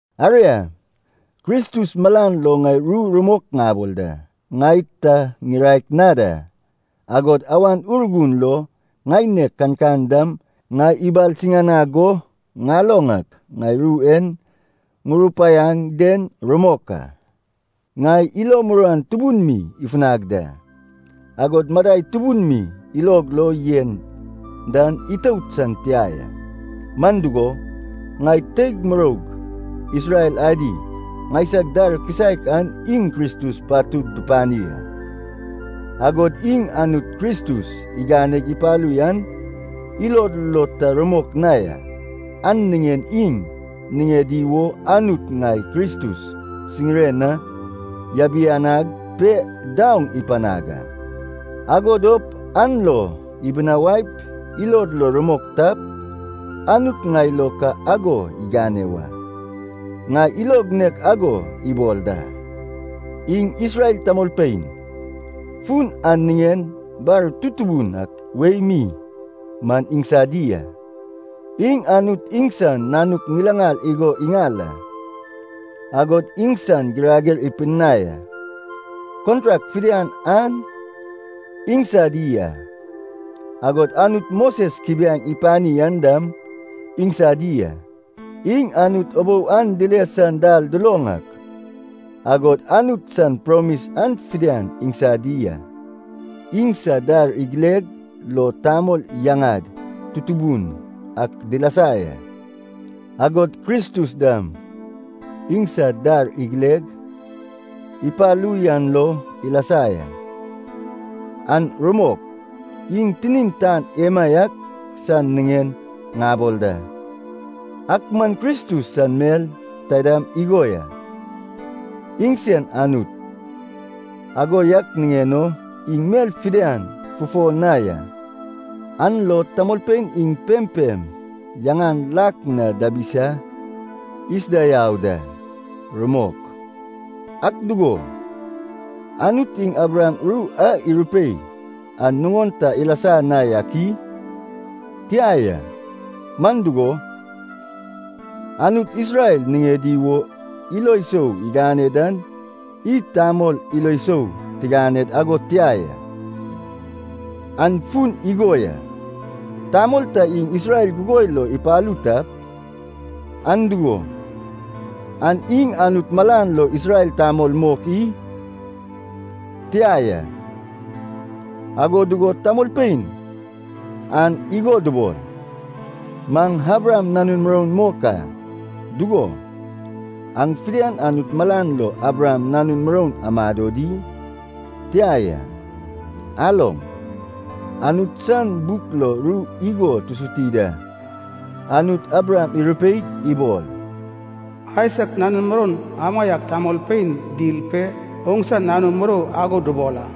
Aria, Kristus malan lo ŋai ru rumok ŋabol da, ŋai ta ŋiraek na da. Agod Awan Urgun lo ŋaineg kankan dam ŋai ibalsiŋanag go ŋaloŋ ak, ŋai ru e ŋurupaiaŋ den rumok a. Ŋai ilo muruan tubun mi ifunag da, agod madai tubun mi ilog lo yen dan itout san tia ya. Man dugo, ŋai teig muroug Isrel adi, ŋaisag dar kisaek an iŋ Kristus patud dupani a, agod iŋ Anut Kristus iganeg ipalu yan ilod lo ta rumok na ya. An niŋen iŋ niŋedi wo Anut ŋai Kristus siŋire na yabianag pe daoŋ ipanag a, ago dop an lo ibinawaip ilod lo rumok tap, Anut ŋai lo ka ago igane wa. Ŋai ilog nek ago ibol da. Iŋ Isrel tamolpein, fun an niŋen bar tutubun ak wei mi man iŋsadi a. Iŋ Anut iŋsan nanuk ŋilaŋal igo iŋal a, agod iŋsan girager ipidinai a. Kontrak fidian an iŋsadi a, agod Anut Moses kubiaeŋ ipani an dam iŋsadi a. Iŋ Anut ubou an dile san dal duloŋ ak, agod Anut san promis an fidian iŋsadi a. Iŋsad dar igileg lo tamol yaŋad tutubun ak dilasa ya, agod Kristus dam iŋsad dar igileg ipalu yan lo ilasa ya. (An rumok, iŋ tinin tan emaiak san niŋen ŋabol da.) Ak man Kristus san mel taidam igo ya, iŋsen Anut. Ago yak niŋen o iŋ mel fidian fufo na ya, an lo tamolpein iŋ pempem yaŋan lak na diabisa isuda yau da. Rumok. Ak dugo, Anut iŋ Abraham ru a irupei an nuŋon ta ilasa na yak i? Tia ya, man dugo, Anut Isrel niŋedi wo ilo sou igane dan id tamol ilo sou tiganed ago tia ya. An fun igo ya, tamol ta iŋ Isrel gugoi lo ipalu tap, an dugo, an iŋ Anut malan lo Isrel tamol mok i? Tia ya. Ago dugo tamolpein an igo dubol, “Maŋ Abraham nanun muroun mok a,” dugo, an fidian Anut malan lo Abraham nanun muroun dumado di? Tia ya. Aloŋ, Anut san buk lo ru igo tusuti da, Anut Abraham irupeig ibol, “Aisak nanun muroun amaiak tamolpein dil pe oŋsa nanu murou ago dubol a.”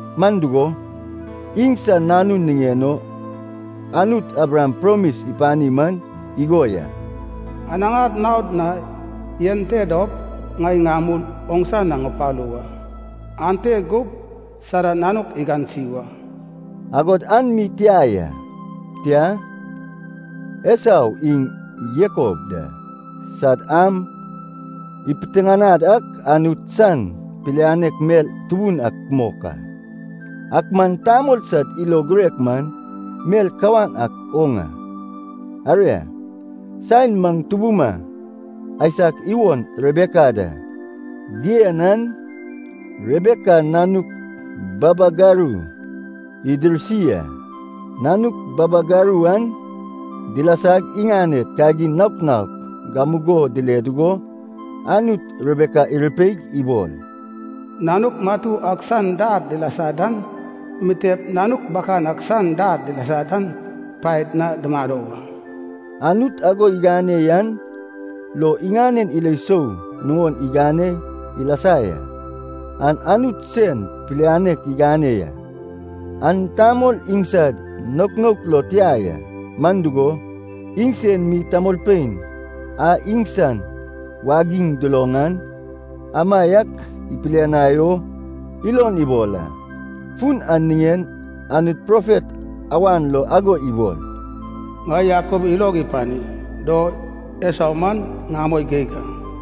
Man dugo, iŋsan nanun niŋen o Anut Abraham promis ipani man igo ya, “Anaŋar naod na yan te dop ŋai ŋamul oŋsa na ŋupalu wa, ante gup Sara nanuk igansi wa.” Agod an mi tia ya, tia, Esau iŋ Jakob da sad am ipiteŋanad ak Anut san pilianek mel tubun mok a, ak man tamol sad ilo girek man mel kawan ak oŋ a. Aria, saen maŋ tubuma Aisak iwon Rebeka da dien an Rebeka nanuk babagaru idirsi a. Nanuk babagaru an dilasag iŋaned kagin naok naok gamugo dile dugo Anut Rebeka irupeig ibol, “Nanuk matu ak san dar dilasa dan mitep nanuk bakan ak san dar dilasa dan paed na dumado wa.” Anut ago igane yan lo iŋanen ilo sou nuŋon igane ilasa ya. An Anut sen pilianek igane ya, an tamol iŋsad naok naok lo tia ya. Man dugo, iŋsen mi tamolpein a iŋsan wagiŋ duloŋ an, amaiak ipilianai o ilon ibol a. Fun an niŋen Anut profet awan lo ago ibol, “Ŋai Jakob ilog ipani do Esau man ŋamoi geig a.”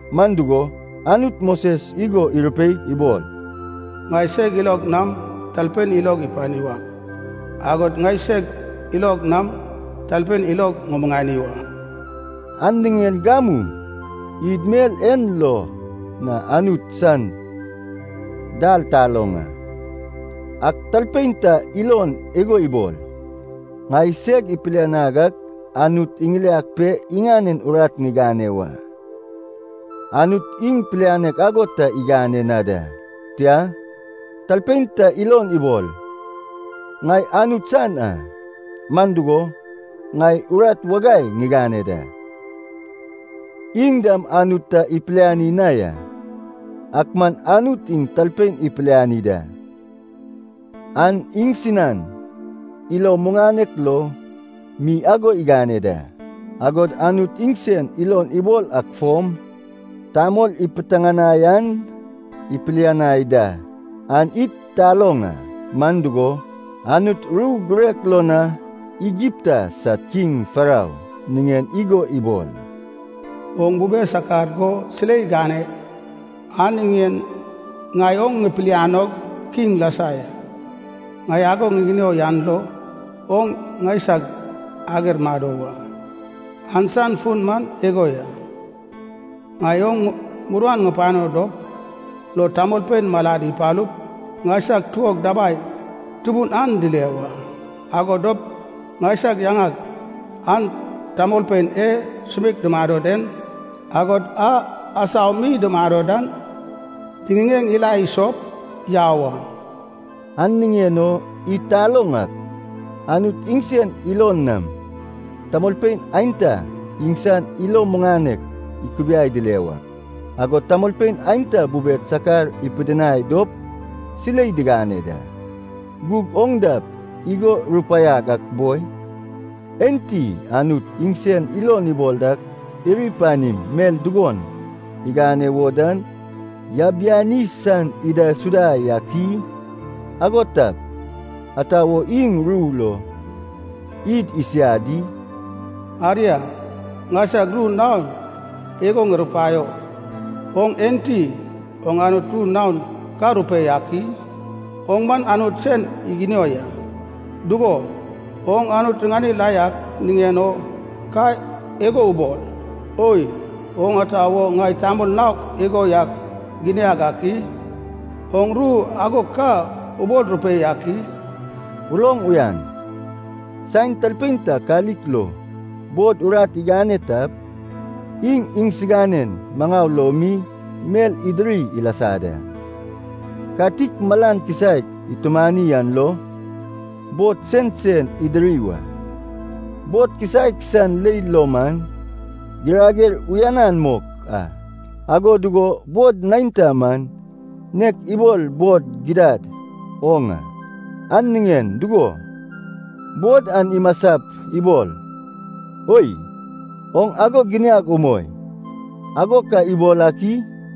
Man dugo, Anut Moses igo irupeig ibol, “Ŋai seg ilog nam talpein ilog ŋupani wak, agod ŋai seg ilog nam talpein ilog imuŋani wa.” An niŋen gamu id mel en lo na Anut san dal taloŋ a. Ak talpein ta ilon ago ibol, “Ŋai seg ipilianag ak Anut iŋiliag pe iŋanen urat ŋigane wa.” Anut iŋ pilianek ago ta igane na da. Tia, talpein ta ilon ibol, “Ŋai Anut san a, man dugo, ŋai urat wagai ŋigane da.” Iŋ dam Anut ta ipiliani na ya. Ak man Anut iŋ talpein ipiliani da, an iŋsinan ilo muŋanek lo mi ago igane da. Agod Anut iŋsen ilon ibol ak fom tamol ipitiŋinai an ipilianai da. An id taloŋ a, man dugo, Anut ru girek lo na Igipta sad kiŋ Farou niŋen igo ibol, “Oŋ bube sakar go silei gane an niŋen ŋai oŋ ŋipilianog kiŋ lasa ya. Ŋai ago ŋiginio yan lo oŋ ŋaisag ager mado wa. An san fun igo ya, ŋai oŋ muruan ŋupano dop lo tamolpein malad ipalup ŋaisag tuog dabai tubun an dile wa. Ago dop ŋaisag yaŋag an tamolpein e sumeik dumado den, agod a asau mi dumado dan diŋiŋeŋ ila isop yau a.” An niŋen o id taloŋ ak, Anut iŋsen ilon nam tamolpein aenta iŋsan ilo muŋanek ikubiai dile wak, agod tamolpein aenta bube sakar ipidinai dop silei digane da. Gug oŋ dap igo rupaiag ak boi, “Enti Anut iŋsen ilon ibol ak iri panim mel dugon igane wo dan yabiani san idaisuda yak i? Ago tap, ata wo iŋ ru lo id isiad di?” Aria, ŋaisag ru naon igo ŋurupaio. Oŋ enti, oŋ Anut ru naon ka rupei ak i? Oŋ man Anut sen iginio ya. Dugo, oŋ Anut riŋanig lak na yak niŋen o ka igo ubol, “Oi, oŋ ata wo ŋai tamol naok igo yak giniag ak i?” Oŋ ru ago ka ubol rupei ak i? Uloŋ uyan, saen talpein ta katik lo bod urat igane tap, iŋ iŋsinanen maŋau lo mi mel idiri ilasa da. Katik malan kisaek itumani an lo, bod sensen idiri wa. Bod kisaek san leil lo man girager uyanan mok a. Ago dugo bod neinta man nek ibol bod gidad oŋ a. An niŋen dugo, bod an imasap ibol, “Oi, oŋ ago giniag umoi,” ago ka ibol ak i?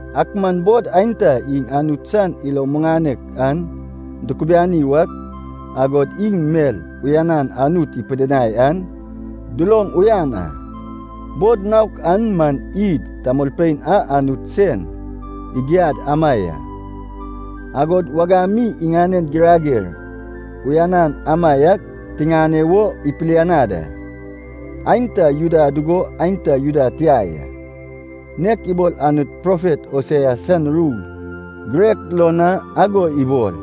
Ak man bod aenta iŋ Anut san ilo muŋanek an dukubiani wak, agod iŋ mel uyanan Anut ipidinai an duloŋ uyan a. Bod naok an man id tamolpein a Anut sen igiad ama ya, agod wagam mi iŋanen girager uyanan amaiak tiŋane wo ipilianad a. Aenta Juda dugo aenta Juda tia ya. Nek ibol Anut profet Hosea san ru girek lo na ago ibol,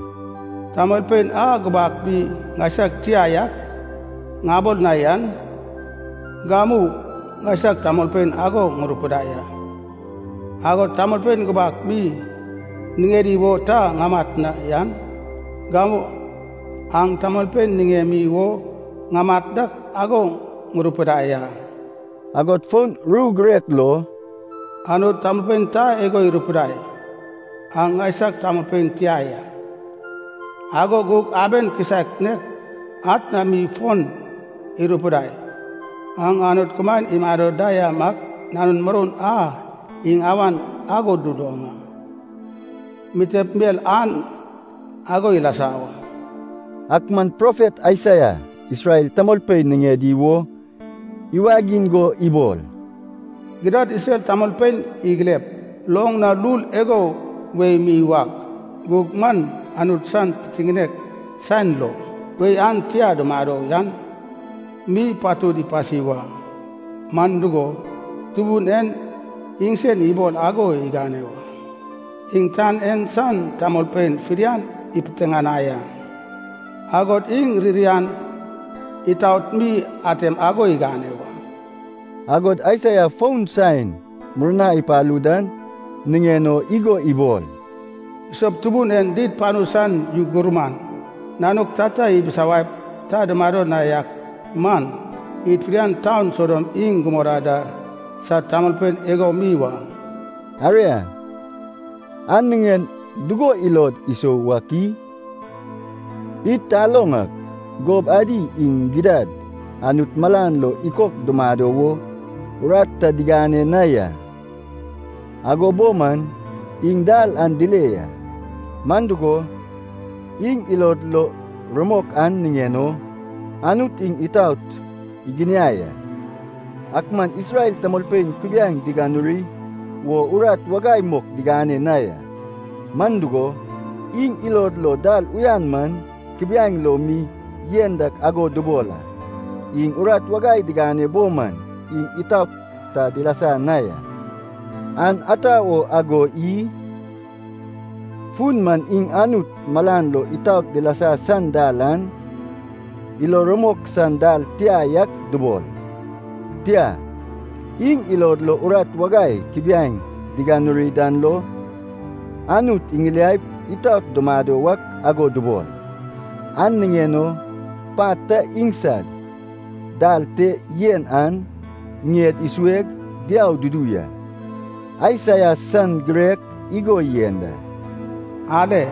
“Tamolpein a gubak mi ‘ŋaisag tia yak’ ŋabol na yan, gamu ‘ŋaisag tamolpein’ ago ŋurupidai a, agod tamolpein gubak mi niŋedi wo ta ŋamat na yan, gamu ‘aŋ tamolpein niŋemi wo ŋamat dak’ ago ŋurupidai a.” Agod fon ru girek lo, “Anut tamolpein ta igo irupidai ‘aŋ ŋaisag tamolpein tia ya,’ ago gug aben kisaek nek atna mi fon irupidai ‘aŋ Anut kumaen imado damaiak nanun muroun a’ iŋ awan ago duloŋ a. Mitep mel an ago ilasa wa.” Ak man profet Aisaia Isrel tamolpein niŋedi wo iwagiŋ go ibol, “Gidad Isrel tamolpein igilep loŋ na lul igo wei mi wak, gug man Anut san pitiŋinek saen lo wei an tia dumado yan mi patud ipasi wa. Man dugo, Tubun en iŋsen ibol ago igane wa, iŋ tan en san tamolpein fidian ipitiŋinai a, agod iŋ ririan, itaot mi atem ago igane wa.” Agod Aisaia fon saen murna ipalu dan niŋen o igo ibol, “Isop Tubun en did panu san yu gurman nanuk tata ibisawaip ta dumado na yak man, id fidian taun Sodom iŋ Gomora da sad tamolpein igo mi wa.” Aria, an niŋen dugo ilod isou wak i? Id taloŋ ak gob adi iŋ gidad Anut malan lo ikok dumado wo urat ta digane na ya, ago bo man iŋ dal an dile ya. Man dugo, iŋ ilod lo rumok an niŋen o Anut iŋ itaot iginiai a. Ak man Isrel tamolpein kubiaeŋ diganuri wo urat wagai mok digane na ya. Man dugo, iŋ ilod lo dal uyan man kubiaeŋ lo mi yen dak ago dubol a. Iŋ urat wagai digane bo man iŋ itaot ta dilasa na ya. An ata wo ago i? Fun man iŋ Anut malan lo itaot dilasa san dal an ilo rumok san dal tia yak dubol. Tia, iŋ ilod lo urat wagai kubiaeŋ diganuri dan lo, Anut iŋiliaip itaot dumado wak ago dubol. An niŋen o pat ta iŋsad dal te yen an ŋied isueg diau dudu ya. Aisaia san girek igo yen da, “Ale,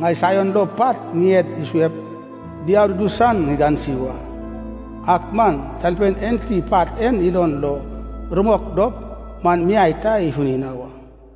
ŋai Saion lo pat ŋied isuep, diau dudu san ŋigansi wa. Ak man talpein enti pat en ilon lo rumok dop man miai ta ifuni na wa.”